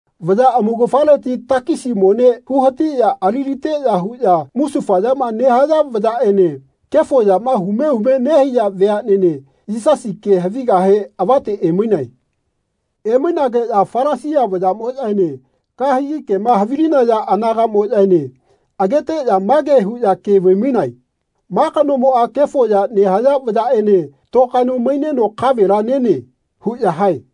Vaya amaugafaleti takisi mone huhatiꞌya aliliteꞌya huꞌya musufayama nehaya vayaꞌene kefo yama hume hume nehaiya veaꞌnene Yisasi ke havigahe avate emainae. Emainageꞌya Falasia vayaꞌmoꞌyaene kahegi kema havilinaya anagaꞌmoꞌyaene ageteꞌya mage huꞌya ke vaimainae “Ma kanomoꞌa kefo ya nehaya vayaꞌene tokaeno maineno kavela nene.” huꞌya hae.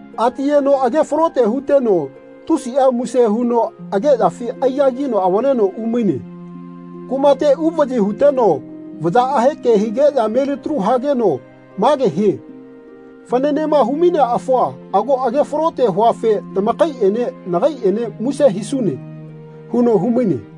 Atiyeno agefalote huteno tusiꞌa muse huno ageꞌyafi aigagino avaleno umaine. Kumate uvaꞌyi huteno vayaꞌahe ke higeꞌya melitalu hageno mage hie ‘Fananema humainea afua ago agefalote huafe tamakaiꞌene nagaiꞌene muse hisune.’ huno humaine.”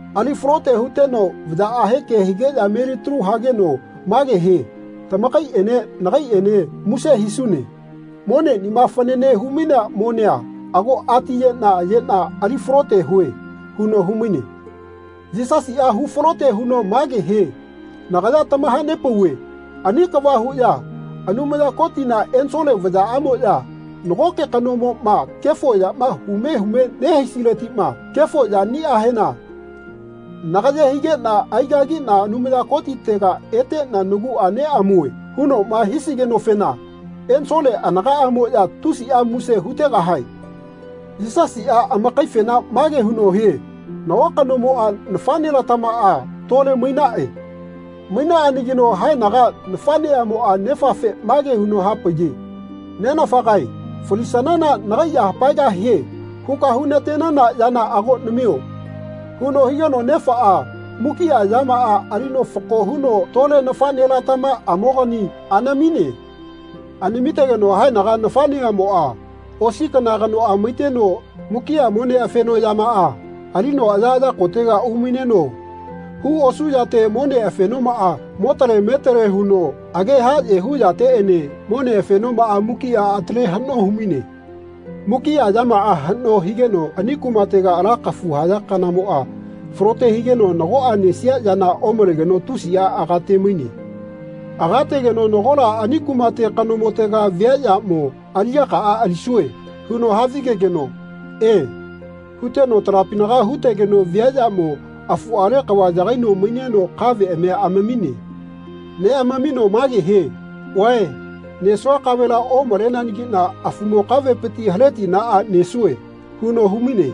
Ali falote huteno vayaꞌahe ke higeꞌya melitalu hageno mage hie “Tamakaiꞌene nagaiꞌene muse hisune. Moneꞌnima fanane humainea monea ago atiyeꞌna yeꞌna ali falote hue.” huno humaine. Yisasiꞌa hufalote huno mage hie “Nagaya tamahanepauve ani kava huꞌya Anumaya Kotina ensole vayaꞌamoꞌya nagoke kanomoꞌma kefo yama hume hume nehaisiletiꞌma ‘Kefo yaniꞌahena nagaye higeꞌna aigagiꞌna Anumaya Kotitega eteꞌna naguꞌa neꞌamue.’ hunoꞌma hisigenofena ensole anagaꞌmoꞌya tusiꞌa muse hutegahae.” Yisasiꞌa amakaifena mage huno hie nago kanomoꞌa nafaꞌnelatamaꞌa tole mainaꞌe. Mainaꞌanagino haenaga nafaꞌnemoꞌa nefafe mage huno hapaiye “Nenafagae falisanana nagai ya hapaegahie huka hunatenana yana ago namio.” huno higeno nefaꞌa mukiꞌa yamaꞌa alino fako huno tole nafaꞌnelatamaꞌamokani anamine. Anamitegeno haenaga nafaꞌneꞌamoꞌa osi kana kanoꞌa maiteno mukiꞌa mone afenoꞌyamaꞌa alino ayaꞌaya kotega umaineno hu osuꞌyate mone afenomaꞌa motale metale huno age haꞌye hu yateꞌene mone afenomaꞌa mukiꞌa atale haꞌno humaine. Mukiꞌa yamaꞌa haꞌno higeno ani kumatega ala kafu haya kanamoꞌa falote higeno nagoꞌa nesia yana omalegeno tusiꞌa agatemaine. Agategeno nagola ani kumate kanomotega viaꞌyamo “Aliꞌyakaꞌa alisue.” huno havigegeno “E.” huteno talapinaga hutegeno viaꞌyamo afuꞌale kava yagaino maineno kaveꞌamia amamine. Neꞌamamino mage hie “Vae nesua kavela omaleanagiꞌna afumo kavepiti haletiꞌnaꞌa nesue.” huno humaine.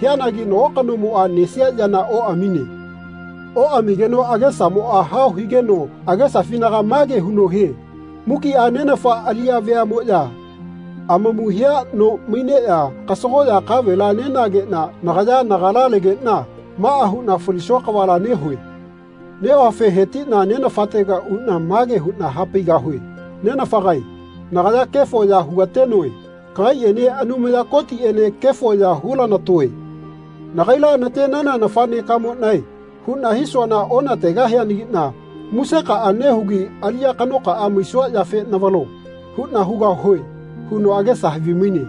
Hianagi nago kanomoꞌa nesia yana oꞌamine. Oꞌamigeno agesamoꞌa hao higeno agesafinaga mage huno hie “Mukiꞌa nenafa aliꞌya veaꞌmoꞌya amamu hia no maineꞌya kasagoꞌya kavela nenageꞌna nagaya nagala legeꞌna maꞌa huꞌna falisua kavala nehue. Nehuafe hetiꞌna nenafatega uꞌna mage huꞌna hapaigahue ‘Nenafagae nagaya kefo ya hugatenoe. Kagaiꞌene Anumaya Kotiꞌene kefo ya hulanatoe. Nagaila natenana nafaꞌnekamoꞌnae huꞌna hisuana onategahianagiꞌna musekaꞌa nehugi aliꞌya kanokaꞌa maisua yafe navalo.’ huꞌna hugahue.” huno agesa havimaine.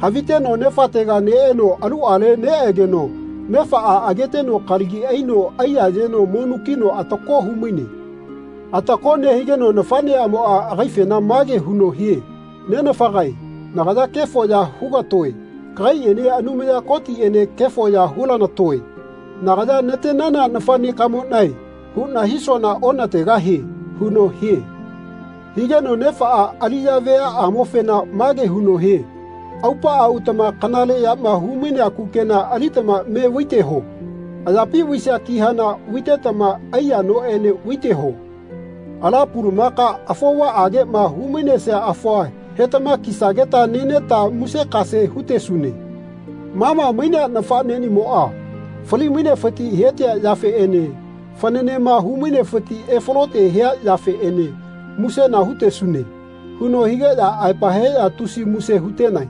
Haviteno nefatega neꞌeno aluꞌale neꞌegeno nefaꞌa ageteno kalagi aino aiyayeno monukino atako humaine. Atako nehigeno nafaꞌneꞌamoꞌa agaifena mage huno hie “Nenafagae nagaya kefo ya hugatoe. Kagaiꞌene Anumaya Kotiꞌene kefo ya hulanatoe. Nagaya natenana nafaꞌnekamoꞌnae huꞌna hisuana onategahie.” huno hie. Higeno nefaꞌa aliꞌya veaꞌamofena mage huno hie “Aupaꞌa utama kanaleꞌyama humainea kukena alitama me vaiteho. Ayapi vaisia kihana vaitetama aiya noꞌene vaiteho. Ala pulumaka afovaꞌageꞌma humainesia afua hetama kisageta neneta musekase hutesune. Ma ma mainea nafaꞌneꞌnimoꞌa fali-mainefiti hetia yafeꞌene fananema hu-mainefiti efalote hia yafeꞌene musena hutesune.” huno higeꞌya aepa heꞌya tusi muse hutenae.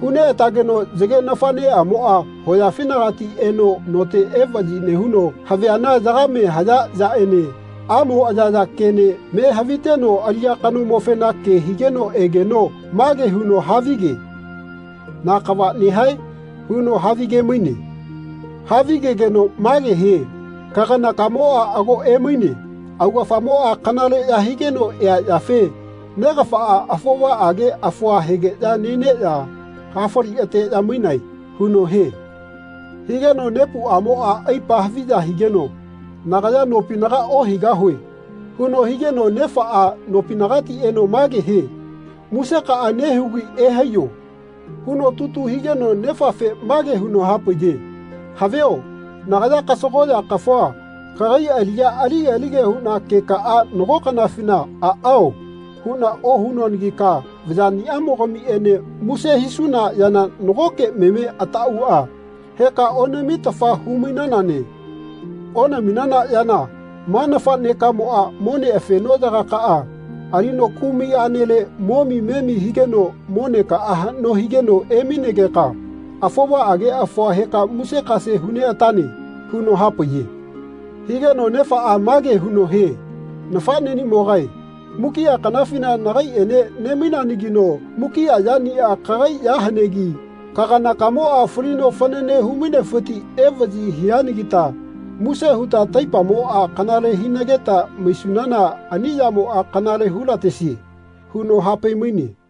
Huneꞌatageno yage nafaꞌneꞌamoꞌa hoyafinagati eno note evaꞌyi nehuno haviana yagame haya yaꞌene amo ayaya kene me haviteno aliꞌya kanomofena ke higeno egeno mage huno havige “Na kava nehae?” huno havigemaine. Havigegeno mage hie “Kaganakamoꞌa ago emaine. Augafamoꞌa kanaleꞌya higeno ea yafe negafaꞌa afovaꞌage afua hegeꞌya neneꞌya hafali ateꞌya mainae.” huno hie. Higeno nepuꞌamoꞌa aipa haviya higeno “Nagaya nopinaga ohaigahue.” huno higeno nefaꞌa nopinagati eno mage hie “Musekaꞌa nehugi ehaiyo.” huno tutu higeno nefafe mage huno hapaiye “Havio nagaya kasagoꞌya kafua kagai aliꞌya alige-lige huꞌna kekaꞌa nago kanafina ‘Aꞌao.’ huꞌna ohunuanagika vayaꞌniꞌamogamiꞌene muse hisuna yana nagoke meme ataꞌauꞌa heka onamitafa hu-mainanane. Onaminana yana ma nafaꞌnekamoꞌa mone fenoꞌyagakaꞌa alino kumai aꞌnele momi memi higeno monekaꞌa haꞌno higeno emainegeka afovaꞌage afua heka musekase huneꞌatane.” huno hapaiye. Higeno nefaꞌa mage huno hie “Nafaꞌneꞌnimogae mukiꞌa kanafina nagaiꞌene nemainanagino mukiꞌa yaniꞌa kagai ya hanegi kaganakamoꞌa falino fanane humainefiti evaꞌyi hianagita muse huta taipamoꞌa kanale hinageta maisunana ani yamoꞌa kanale hulatesie.” huno hapaimaine.